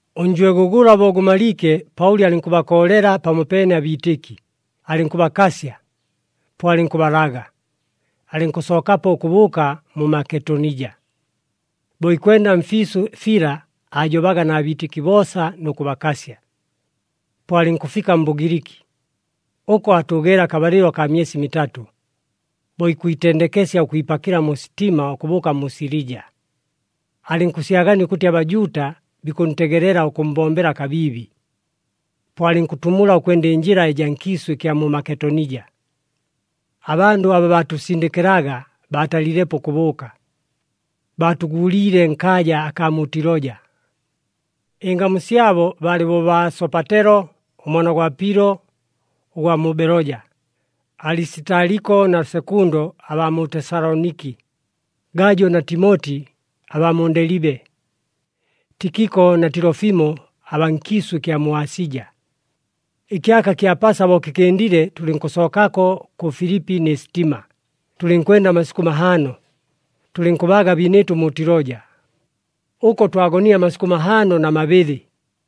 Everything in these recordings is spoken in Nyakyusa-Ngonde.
Ʉnjwego gʉla bo gʉmaliike, Paʉli alɨnkʉbakoolela pamopeene abiitɨki, alɨnkʉbakasya. Po alɨnkʉbalaga, alɨnkʉsookapo ʉkʉbʉʉka mu Maketonija. Bo ikwenda mfiisʉ fila, aajobaga na biitɨki boosa nʉ kʉbakasya. Po alɨnkʉfika mBʉgiliki, ʉko aatʉʉgeele akabalɨlo akaa myesi mitatʉ. Bo ikwitendekesya ʉkwipakɨla mu sitima ʉkʉbʉʉka mu Silija, alɨnkʉsyagania ʉkʉtɨ aBajuuta bikʉntegelela ʉkʉmmbombela kabiibi. Po alɨnkʉtumula ʉkwenda ɨnjɨla ɨjaa nkiisʉ ɨkya mu Maketonija. Abandʉ abaa baatʉsindɨkɨlaga baatalilepo ʉkʉbʉʉka, baatʉguuliile nkaaja akaa mu Tiloja. Ɨngamu syabo baalɨ bo baa Sopatelo ʉmwana gwa Pilo ʉgwa mu Beloja, Alisitaliko na Sekundo abaa mu Tesaloniki, Gajo na Timoti abaa mu Ndelibe, Tikiko na Tilofimo abaa nkiisʉ ɨkya mu Asija. Ɨkyaka kya Pasa bo kɨkɨndile, tʉlɨnkʉsookako kʉ Filipi nɨ sitima, tʉlɨnkwenda amasikʉ mahaano, tʉlɨnkʉbaaga abiinɨɨtʉ mu Tiloja. Ʉko twagonile amasikʉ mahaano na mabɨlɨ.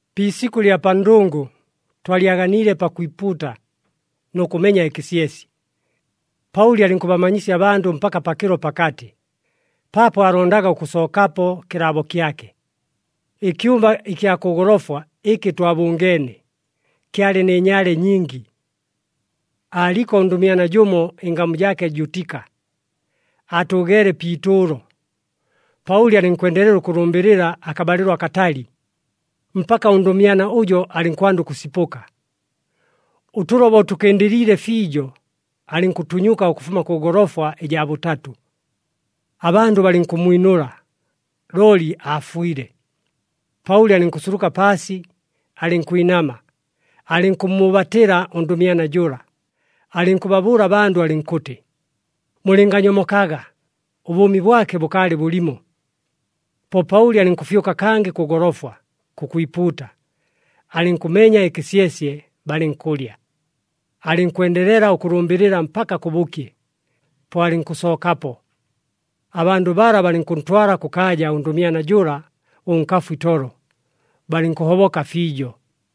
Pi isikʉ ɨlya pa ndʉngʉ, twalyaganiile pakwipuuta nʉ kʉmenya ɨkɨsyesye. Paʉli alɨnkʉbamanyisya abandʉ mpaka pakɨlo pakatɨ, paapo aalondaga ʉkʉsookapo kɨlaabo kyake. Ɨkyumba ɨkya kʉ golofwa ɨkɨ twabʉngeene, kyalɨ nɨ nyaale nyingi. Aaliko ʉndʉmyana jʉmo, ɨngamu jaake Jutika, aatʉʉgeele pi itʉʉlo. Paʉli alɨnkwendelela ʉkʉlʉmbɨlɨla akabalɨlo akatali, mpaka ʉndʉmyana ʉjo alɨnkwanda ʉkʉsipʉka. Ʉtʉlo bo tʉkɨndɨliile fiijo, alɨnkʉtunyuka ʉkʉfuma kʉ golofwa ɨjaa bʉtatʉ. Abandʉ balɨnkʉmmwinʉla, looli aafwile. Paʉli alɨnkʉsuluka paasi, alɨnkwinama, alɨnkʉmmʉʉbatɨla ʉndʉmyana jʉla, alɨnkʉbabʉʉla abandʉ alɨnkʉtɨ, “Mulɨnganyomokaga, ʉbʉʉmi bwake bʉkaalɨ bʉlimo!” Po Paʉli alɨnkʉfyʉka kangɨ kʉ golofwa kʉkwipuuta, alɨnkʉmenya ɨkɨsyesye, balɨnkʉlya. Alɨnkwendelela ʉkʉlʉmbɨlɨla mpaka kʉbʉkye, po alɨnkʉsookapo. Abandʉ bala, balɨnkʉntwala kʉkaaja ʉndʉmyana jʉla ʉnkafu itolo, balɨnkʉhoboka fiijo.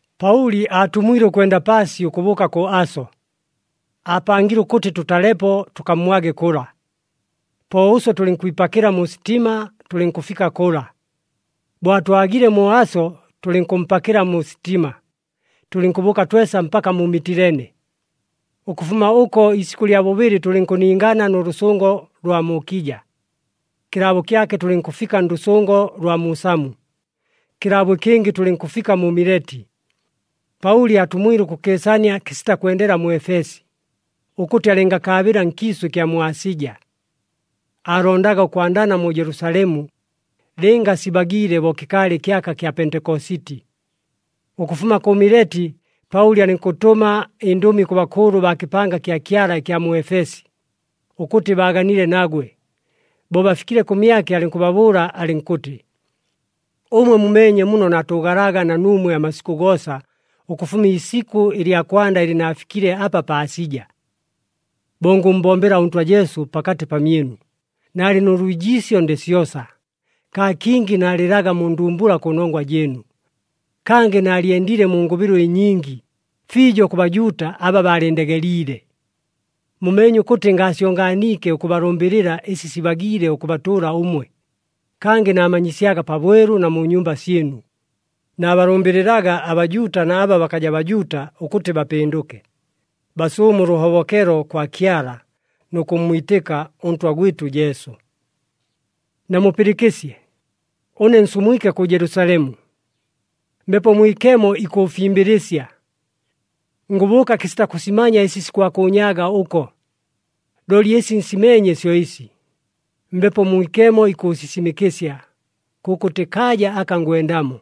Paʉli aatumwile ʉkwenda paasi ʉkʉbʉʉka kʉ Aso. Aapangile ʉkʉtɨ tʉtalepo tʉkammwage kʉla. Po ʉswe tʉlɨnkwipakɨla mu sitima, tʉlɨnkʉfika kʉla. Bo atwagile mu Aso, tʉlɨnkʉmpakɨla mu sitima, tʉlɨnkʉbʉʉka twesa mpaka mu Mitilene. Ʉkʉfuma ʉko iisikʉ lya bʉbɨlɨ tʉlɨnkʉningana nʉ lʉsʉngo lwa mu Kija. Kɨlaabo kyake tʉlɨnkʉfika ndʉsʉngo lwa mu Samu, kɨlaabo ɨkɨngɨ tʉlɨnkʉfika mu Mileti. Paʉli aatumwile ʉkʉkɨɨsania kɨsita kwendela mu Efesi, ʉkʉtɨ alɨngakaabɨla nkiisʉ ɨkya mu Asija. Aalondaga ʉkwandana mu Jelusalemu, lɨnga sibagiile bo kɨkaalɨ ɨkyaka kya Pentekositi. Ʉkʉfuma kʉ Mileti, Paʉli alɨnkʉtʉma ɨndʉmi kʉ bakʉʉlʉ baa kɨpanga kya Kyala ɨkya mu Efesi, ʉkʉtɨ baaganile nagwe. Bo bafikile kʉmyake, alɨnkʉbabʉʉla alɨnkʉtɨ, “Ʉmwe mumeenye muno naatʉʉgalaga na nuumwe amasikʉ goosa ʉkʉfuma iisikʉ lya kwanda ɨlɨ naafikile apa pa Asija. Bo ngʉmmbombela ʉNtwa Jesu pakatɨ pamyɨnu, naalɨ nʉ lwijiisyo ndɨ syosa, kaa kingi naalɨlaga mu ndumbula kʉnongwa jɨɨnu. Kangɨ naalyendile mu ngʉbɨlo ɨnyingi, fiijo kʉ Bajuuta aba baalɨndegeliile. Mumeenye ʉkʉtɨ ngaasyonganiike ʉkʉbalʉmbɨlɨla ɨsi sibagiile ʉkʉbatʉʉla ʉmwe, kangɨ naamanyisyaga pabwelu na mu nyumba syɨnu. Naabalʉmbɨlɨlaga aBajuuta na aba bakaja Bajuuta ʉkʉtɨ bapɨndʉke, basʉʉme ʉlʉhobokelo kwa Kyala, nʉ kʉmmwitɨka ʉNtwa gwɨtʉ Jesu. “Namupɨlɨkɨsye. Ʉne nsumwike kʉ Jelusalemu, Mbepo Mwikemo ikʉʉfimbɨlɨsya. Ngʉbʉʉka kɨsita kʉsimanya ɨsi sikwakʉʉnyaaga ʉko. Looli ɨsi nsimeenye syo ɨsi, Mbepo Mwikemo ikʉʉsisimɨkɨsya, kʉkʉtɨ kaaja aka ngwendamo,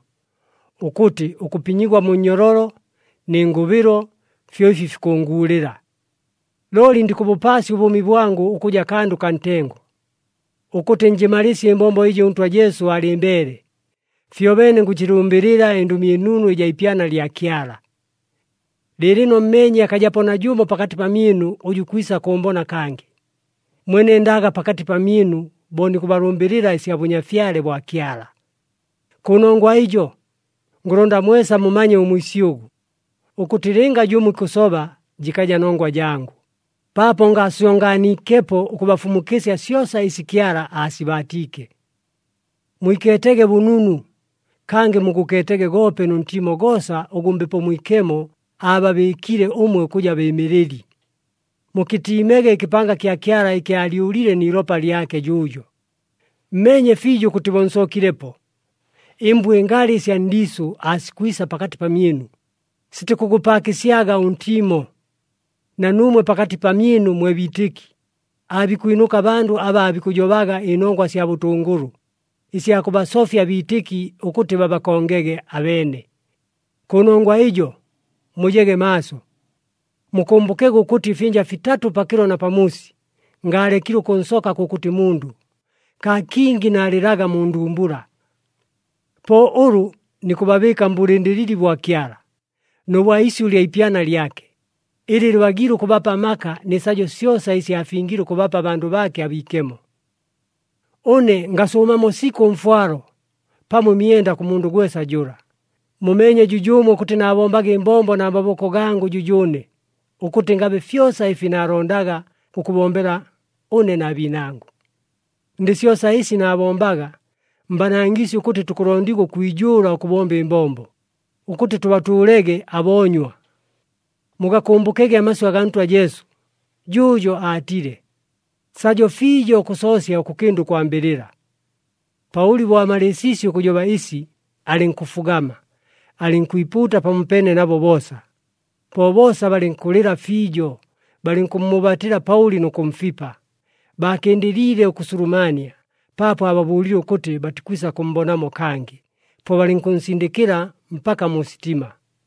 ʉkʉtɨ ʉkʉpinyigwa mu nnyololo nɨ ngʉbɨlo fyo ɨfi fikʉʉnguulɨla. Looli ndikʉbʉpaasya ʉbʉʉmi bwangʉ ʉkʉja kandʉ kaa ntengo, ʉkʉtɨ njɨmalɨɨsye ɨmbombo ɨjɨ ʉNtwa Jesu aalɨmbeele, fyobeene ngʉjɨlʉmbɨlɨla ɨNdʉmi ɨNunu ɨjaa ipyana lya Kyala. “Lɨɨlɨno mmeenye akajapo najʉmo pakatɨ pamyɨnu ʉjʉ ikwisa kʉʉmbona kangɨ, mwe nendaga pakatɨ pamyɨnu bo nikʉbalʉmbɨlɨla ɨsya Bʉnyafyale bwa Kyala. Kʉnongwa ɨjo, ngʉlonda mwesa mumanye ʉmwisyʉgʉ, ʉkʉtɨ lɨnga jʉmo ikʉsoba jɨkaja nongwa jangʉ, paapo ngaasyonganiikepo ʉkabafumukɨsya syosa ɨsi Kyala aasibaatiike. Mwikeetege bʉnunu, kangɨ mugʉkeetege goope nʉ ntiimo goosa ʉgʉ Mbepo Mwikemo aababɨɨkile ʉmwe ʉkʉja bɨɨmɨlɨli. Mukɨtiimege ɨkɨpanga kya Kyala ɨkɨ aalyʉlile ni ilopa lyake jʉʉjo. Mmeenye fiijo ʉkʉtɨ bo nsookilepo, ɨmbwa ɨngalɨ ɨsya ndiisʉ aasikwisa pakatɨ pamyɨnu, sitikʉgʉpaakɨsyaga ʉntiimo. Na nuumwe pakatɨ pamyɨnu mwe biitɨki, aabikwinʉka abandʉ aba aabikʉjobaga ɨnongwa sya bʉtʉngʉlʉ, ɨsya kʉbasofya abiitɨki ʉkʉtɨ babakongege abeene. Kʉnongwa ɨjo, mujege maaso! Mukʉmbʉkege ʉkʉtɨ ɨfyɨnja fitatʉ pakɨlo na pamuusi, ngaalekile ʉkʉnsoka kʉkʉtɨ mundʉ, kaa kingi naalɨlaga mu ndumbula. “Po ʉlʉ nikʉbabɨɨka mbʉlɨndɨlɨli bwa Kyala nʉ bwa isyʉ ɨlya ipyana lyake, ɨlɨ lɨbagiile ʉkʉbapa amaka nɨ sajo syosa ɨsi aafingile ʉkʉbapa abandʉ baake abiikemo. Ʉne ngasʉʉmamo sikʉ ʉmfwalo, pamo ɨmyenda kʉ mundʉ gwesa jʉla. Mumeenye jʉjʉʉmwe ʉkʉtɨ naabombaga ɨmbombo na maboko gangʉ jʉjʉʉne, ʉkʉtɨ ngabe fyosa ɨfi naalondaga ʉkʉbombela, ʉne na biinangʉ. Ndɨ syosa ɨsi naabombaga, mbanangiisye ʉkʉtɨ tukʉlondigwa ʉkwijʉʉla ʉkʉbomba ɨmbombo, ʉkʉtɨ tʉbatʉʉlege aboonywa. Mugakʉmbʉkege amasyʉ agaa Ntwa Jesu, jʉʉjo aatile, ‘Sajo fiijo ʉkʉsoosya ʉkʉkɨnda ʉkwambɨlɨla.’” Paʉli bo amalɨɨsiisye ʉkʉsijoba ɨsi, alɨnkʉfugama, alɨnkwipuuta pamopeene nabo boosa. Po boosa balɨnkʉlɨla fiijo, balɨnkʉmmʉʉbatɨla Paʉli nʉ kʉmfipa. Baakɨndɨliile ʉkʉsulumania, paapo aababʉʉlile ʉkʉtɨ batikwisa kʉmmbonamo kangɨ. Po balɨnkʉnsindɨkɨla mpaka mu sitima.